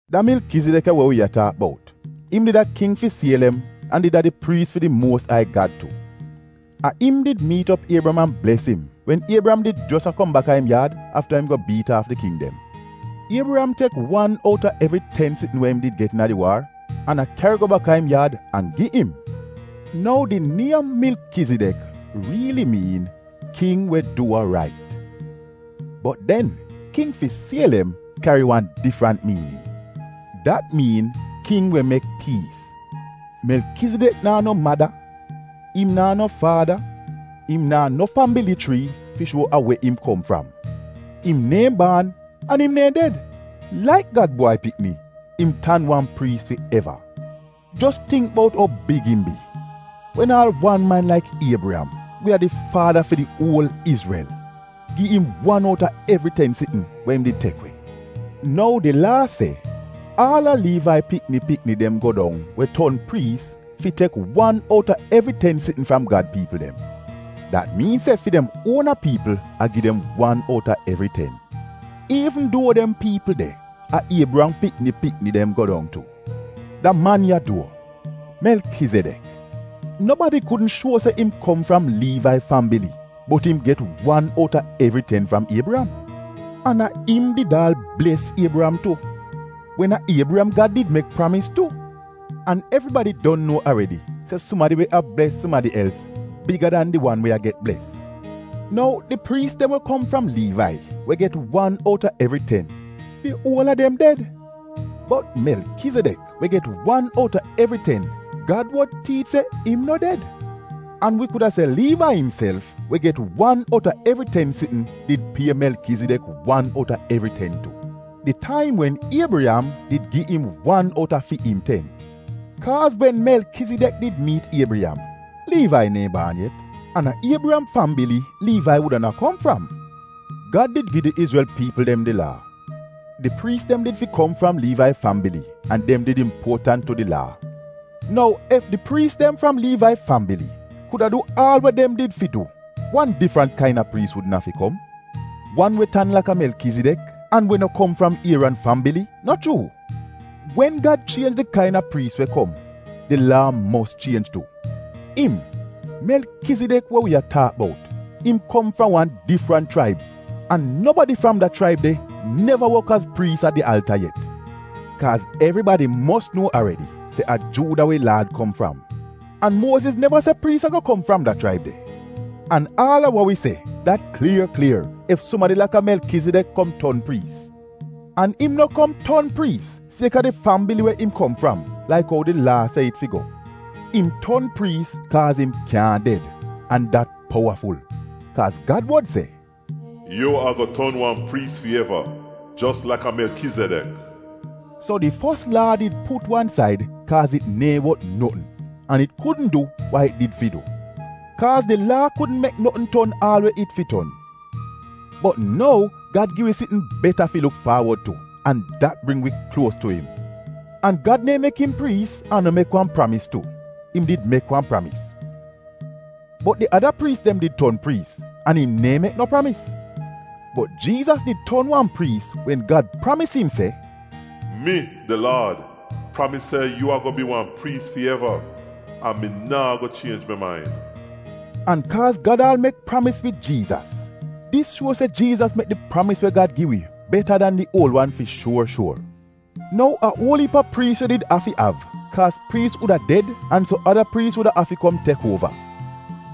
Da Melkezidek ya we wi a taak bout, im did a king fi Sielem, an did a di priis fi di Muos Ai Gad tu. A im did miit op Iebriyam an bles im wen Iebriyam did jos a kom baka im yaad afta im go biit aaf di king dem. Iebriyam tek wan outa evri ten sitn we im did get iina di waar an a kyari go baka im yaad, an gi im. Nou di niem Melkezidek riili miin ‘king we du wa rait,’ bot den ‘king fi Sielem’ kyari wan difrant miinin, dat miin ‘king we mek piis.’ Melkezidek naa no mada, im naa no faada, im naa no fambili chrii fi shuo a we im kom fram. Im neehn baan an im neehn ded, laik Gad Bwai Pikni im tan wan priis fi eva. Jos tingk bout ou big im bi, wen aal wan man laka Iebriyam, we a di faada fi di uol Izrel, gi im wan outa evri ten sitn we im did tek we! Nou di laa se, aal a Liivai pikni pikni dem go dong, we ton priis, fi tek wan outa evri ten sitn fram Gad piipl dem. Dat miin se fi dem uona piipl a gi dem wan outa evri ten, iivn duo dem piipl de a Iebriyam pikni pikni dem go dong tu. Da man ya duo, Melkezidek, nobadi kudn shuo se im kom fram Liivai fambili bot im get wan outa evri ten fram Iebriyam. An a im did aal bles Iebriyam tu — wen a Iebriyam Gad did mek pramis tu. An evribadi don nuo aredi se sumadi we a bles sumadi els, biga dan di wan we a get bles. Nou, di priis dem we kom fram Liivai, we get wan outa evri ten, di uol a dem ded, bot Melkezidek we get wan outa evri ten, Gad wod tiich se im no ded. An wi kuda se Liivai imself, we get wan outa evri ten sitn, did pie Melkezidek wan outa evri ten tu di taim wen Iebriyam did gi im wan outa fi im ten. Kaaz wen Melkezidek did miit Iebriyam, Liivai neehn baan yet, an a Iebriyam fambili Liivai wudaana kom fram. Gad did gi di Izrel piipl dem di laa. Di priis dem did fi kom fram Liivai fambili an dem did impuotant tu di laa. Nou ef di priis dem fram Liivai fambili kuda du aal we dem did fi du, wan difrant kain-a priis wudn afi kom? Wan we tan laka Melkezidek, an we no kom fram Ieran fambili, no chuu? Wen Gad chienj di kain-a priis we kom, di laa mos chienj tu. Im, Melkezidek, we wi a taak bout, im kom fram wan difrant chraib an nobadi fram da chraib de neva wok az priis a di alta yet. Kaaz evribadi mos nuo aredi se a Juuda wi Laad kom fram, an Muoziz neva se priis a-go kom fram da chraib de. An aal a wa wi se, dat klier klier ef sumadi laka Melkezidek kom ton priis; an im no kom ton priis siek-a di fambili we im kom fram laik ou di laa se it fi go. Im ton priis kaaz im kyaahn ded — an dat powaful. Kaaz Gad wod se, “Yu a-go ton wan priis fi eva, jos laka Melkezidek.” So di fos laa did put wan said kaaz it neehn wot notn, an it kudn du wa it did fi du. Kaaz di laa kudn mek notn ton aal we it fi ton. Bot nou Gad gi wi sitn beta fi luk faawod tu an dat bring wi kluos tu im. An Gad neehn mek im priis an no mek wan pramis tu. Im did mek wan pramis! Bot di ada priis dem did ton priis an im neehn mek no pramis. Bot Jiizas did ton wan priis wen Gad pramis im se, “Mi, di Laad, pramis se yu a-go bi wan priis fi eva, an mi naa go chienj mi main!” An kaaz Gad aal mek pramis wid Jiizas, dis shuo se Jiizas mek di pramis we Gad gi wi beta dan di uol wan fi shuor shuor. Nou a uol iip a priis yu did afi av. Kaaz priis wuda ded an so ada priis wuda afi kom tek uova.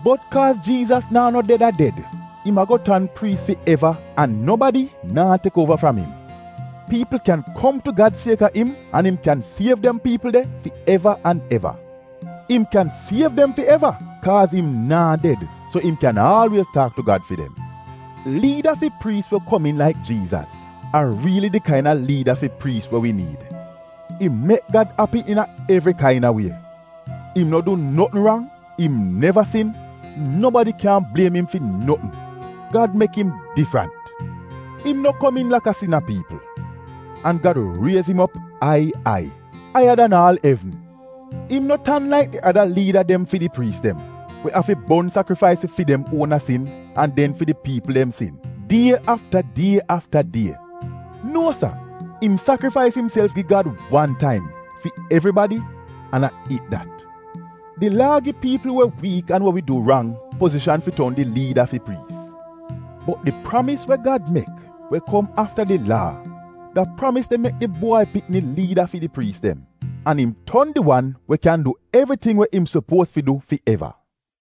Bot Kaaz Jiizas naa no ded a ded, im a-go tan priis fi eva an nobadi naa tek uova fram im. Piipl kyan kom tu Gad siek-a im an im kyan siev dem piipl de fi eva an eva. Im kyan siev dem fi eva kaaz im naa ded so im kyan aalwiez taak tu Gad fi dem. Liida fi priis we komiin laik Jiizas, a riili di kain-a liida fi priis we wi niid. Im mek Gad api iina evri kain-a wie. Im no du notn rang; im neva sin. Nobadi kyaahn bliem im fi notn. Gad mek im difrant, im no komiin laka sina piipl. An Gad riez im op ai ai, aiya dan aal evn. Im no tan laik di ada liida dem fi di priis dem we afi bon sakrifais fi fi dem uona sin an den fi di piipl dem sin die afta die afta die. Nuo sa! Im sakrifais imself gi Gad wan taim, fi evribadi, an a it dat. Di Laa gi piipl we wiik, an we wi du rang, pozishan fi ton di liida fi priis. Bot di pramis we Gad mek, we kom afta di laa, da pramis de mek di Bwai Pikni liida fi di priis dem. An im ton di wan we kyan du evriting we im sopuoz fi du fi eva.